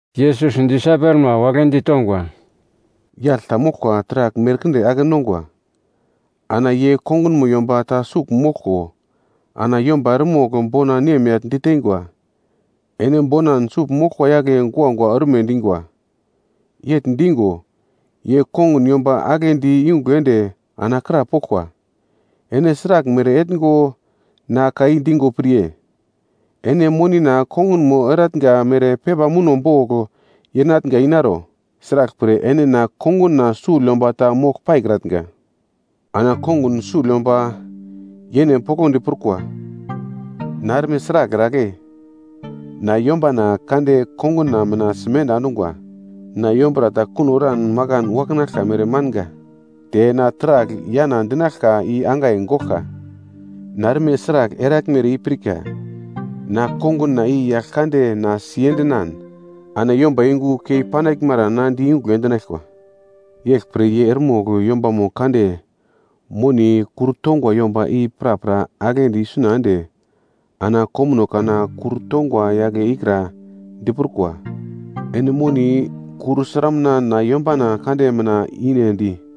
Yesus disaipelma wagle ditongwa, “Yagl ta moglkwa taragl merkinde ake nongwa, ana ye kongunmo yomba ta sugl moglko, ana yomba eremogl bona nemyagl diteingwa, ‘Ene bonan sugl moglkwa yagle guagua orme dingwa.’ Yegl dingo, ye kongun yomba agle di yungugl ende ana krapoglkwa, ‘Ene sraglmere etngo na ka i dingo pirye? Ene monina kongunmo etnga mere pepa muno bogl yenatnga inaro, sraglpre, ene na konguna sugl yomba ta mogl paikratnga.’ “Ana kongun sugl yomba yene poglodi prukwa, ‘Na erme sragl eragle? Na yombana kande konguna mina na simenda endungwa. Na yombura ta kuno eran makan waknaglka mere manga, te na taragl yana dinaglka i angai goglka. Na erme sragl eraglmere i pirka, na konguna i yagl kande na sendinan, ana yomba yungu kei panaglmara na di yungugl endinaglkwa.’ “Yeglpre ye eremogl yombamo kande moni kur tongwa yomba i prapra aglendi isuna ende ana komuno kana kur tongwa yagle ikra diprukwa, ‘Ene moni kur sramuna na yombana kande mina inendi?’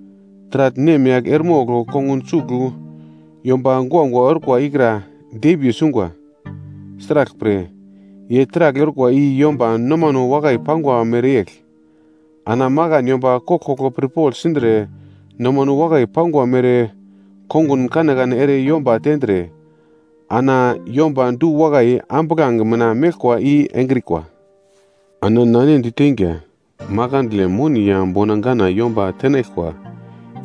“Taragl nemyagl eremogl kongun sugl yomba guagua orkwa ikra dembiye sungwa. Sraglpre, ye taragl orkwa i yomba nomano wakai pangwa mereyegl. Ana makan yomba koglkoglo pirpogl sindre nomano wakai pangwa mere kongun kanekane ere yomba tendre, ana yomba du-wakai ambuglange mina meglkwa i engrikwa. Ana na ene diteinga, makandle moni ya bona gana yomba tenaglkwa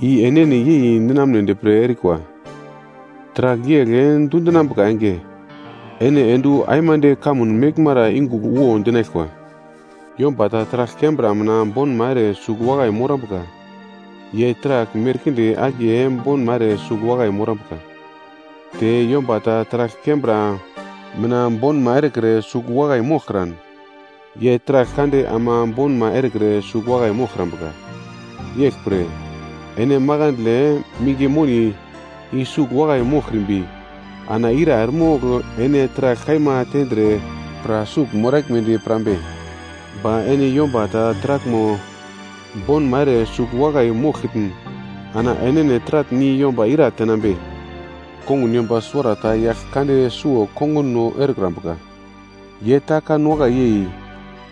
i enene yei ninamnedi pre erikwa, taragl yegl dundinambuka enge, ene ende wu aimande kamun meglmara yungugl wo dinaglkwa. “Yomba ta taragl kembra mina bonma ere sugl wakai morambuka, ye taragl merkinde akiye bonma ere sugl wakai morambuka, te yomba ta taragl kembra mina bonma erekre sugl wakai moglkran, ye taragl kande ama bonma erekre sugl wakai moglkrambuka. Yeglpre, ene makandle minge moni i sugl wakai moglkrimbi, ana ira eremogl ene taragl kaima tendre pra sugl moraglmedi pirambe? Ba ene yomba ta taraglmo bonma ere sugl wakai moglkitn ana enene taratn i yomba ira tenambe? “Kongun yomba suwarata yagl kande suwo konguno erekrambuka, ye ta kan wakai yei,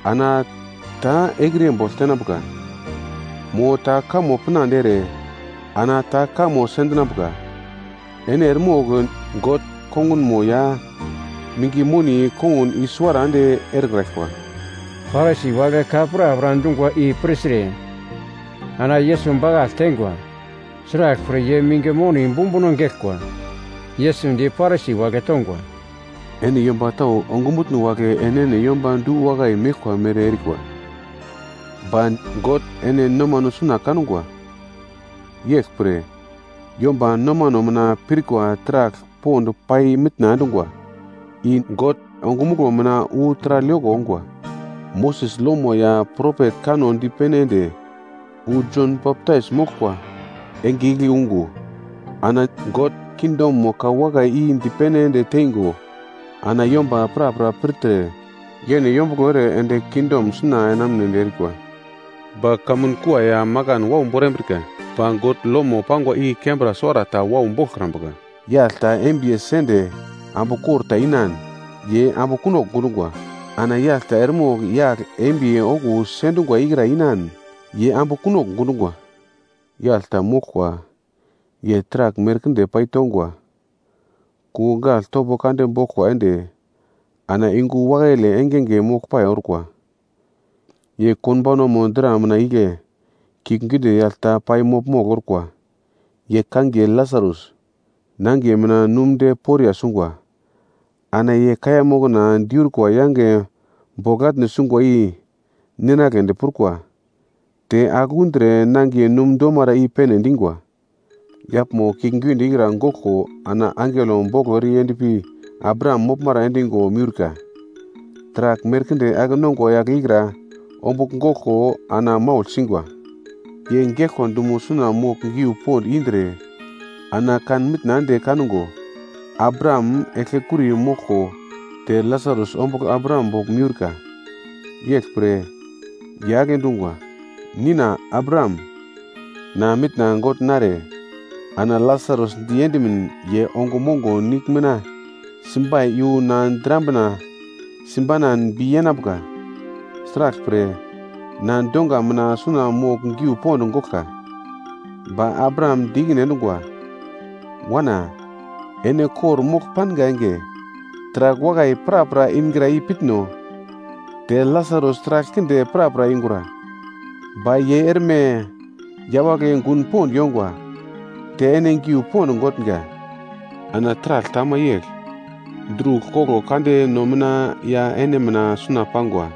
ana ta ekriye bogl tenambuka. Mo ta kamo pinande ere ana ta kamo sendinambuka. Ene eremogl God kongunmo ya minge moni kongun i-suwara ende erekraglkwa.” Parisi wagle ka prapra dungwa i pirtre ana Yesus bakagl teingwa, sraglpre ye minge moni bumbuno geglkwa. Yesus di Parisi wagle tongwa, “Ene yomba tau ongumutno wagle enene yomba du-wakai meglkwa mere erikwa, ba God ene nomano suna kangwa. Yeglpre, yomba nomano mina pirkwa taragl pond pai mitna endungwa, i God ongumuglo mina wu taragl yoko ongwa. “Moses lomo ya propet kanno dipene ende wu Jon Baptais moglkwa enge igle ungo, ana God kingdomo ka wakai i dipene ende teingo, ana yomba prapra pirtre yene yombuglo ere ende kingdom suna enamunedi erikwa. Ba kamun kua ya makan wau borambrika, ba God lomo pangwa i kembra suwara ta wau boglkrambuka. “Yagl ta embiye sende ambu kor ta inan, ye ambu kunogl gundungwa, ana yagl ta eremogl yagl embiye okuwo sendungwa ikra inan, ye ambu kunogl gundungwa. “Yagl ta moglkwa ye taragl merkinde paitongwa, kungugl gagl topo kande boglkwa ende ana yungu wakaile engenge moglpai orkwa. Ye konbaunamo dra mina igle, kiuglgiunde yagl ta pai mogl-mogl orkwa. Ye kangiye Lasarus, nangiye mina num de poriya sungwa. Ana ye kaiya mokna diurkwa yange bogl atne sungwa i ninagledi prukwa, te agl undre nangiye num domara i-pene dingwa. “Yaglmo kiuglgiunde ikra goglko ana angelo boglo ere yendpi Abraham moglmara endingo miurka. Taragl merkinde ake-nongwa yagle ikra ombugl goglko ana maugl singwa. Ye geglkwa dumo suna mogl giu pond indre ana kan mitna ende kango Abraham eglkekuri moglko te Lasarus ombugl Abraham bogl miurka. Yeglpre, ye agle dungwa, ‘Nina Abraham, na mitna gogl nartre, ana Lasarus di endimin ye ongo mongo nigl mina simbai iyu na drambina simbanan bi yenambuka. Sraglpre, na donga mina suna mogl giu pond goglka.’ “Ba Abraham di ikine endungwa, ‘Wana, ene kor-mogl panga enge, taragl wakai prapra ingra i pitno, te Lasarus taragl kinde prapra yungura, ba ye erme yawagle gun pond yongwa, te ene giu pond gotnga. Ana taragl ta ama yegl, drugl kogl kande no mina ya ene mina suna pangwa,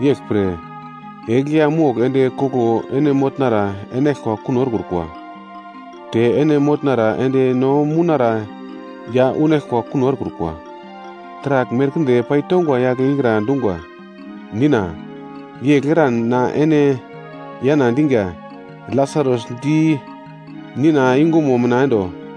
yeglpre eglya mogl ende koglo ene motnara enaglkwa kuno erekrukwa, te ene motnara ende no mounara ya unaglkwa kuno erekrukwa.’ “Taragl merkinde paitongwa yagle ikra dungwa, ‘Nina, yegl eran na ene yana dinga, Lasarus di nina yungumo mina endo.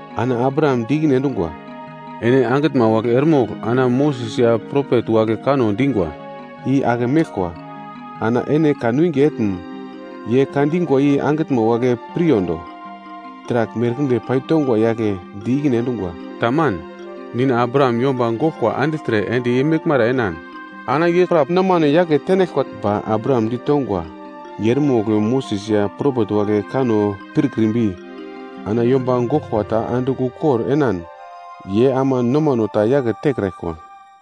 “Ana Abraham di ikine endungwa, ‘Ene angitnma wagle eremogl ana Moses ya propet wagle kanno dingwa i ake meglkwa ana ene kanwinge etn ye ka dingwa i angitnma wagle piryondo.’ “Taragl merkinde paitongwa yagle di ikine endungwa, ‘Taman, Nina Abraham, yomba goglkwa andigltre ende ye meglmara enan ana ye pra nomano yake tenaglkwa.’ “Ba Abraham ditongwa, ‘Ye eremogl Moses ya propet wagle kanno pirkrimbi ana yomba goglkwa ta andigl ukor enan ye ama nomano ta yake tekraglkwa.’”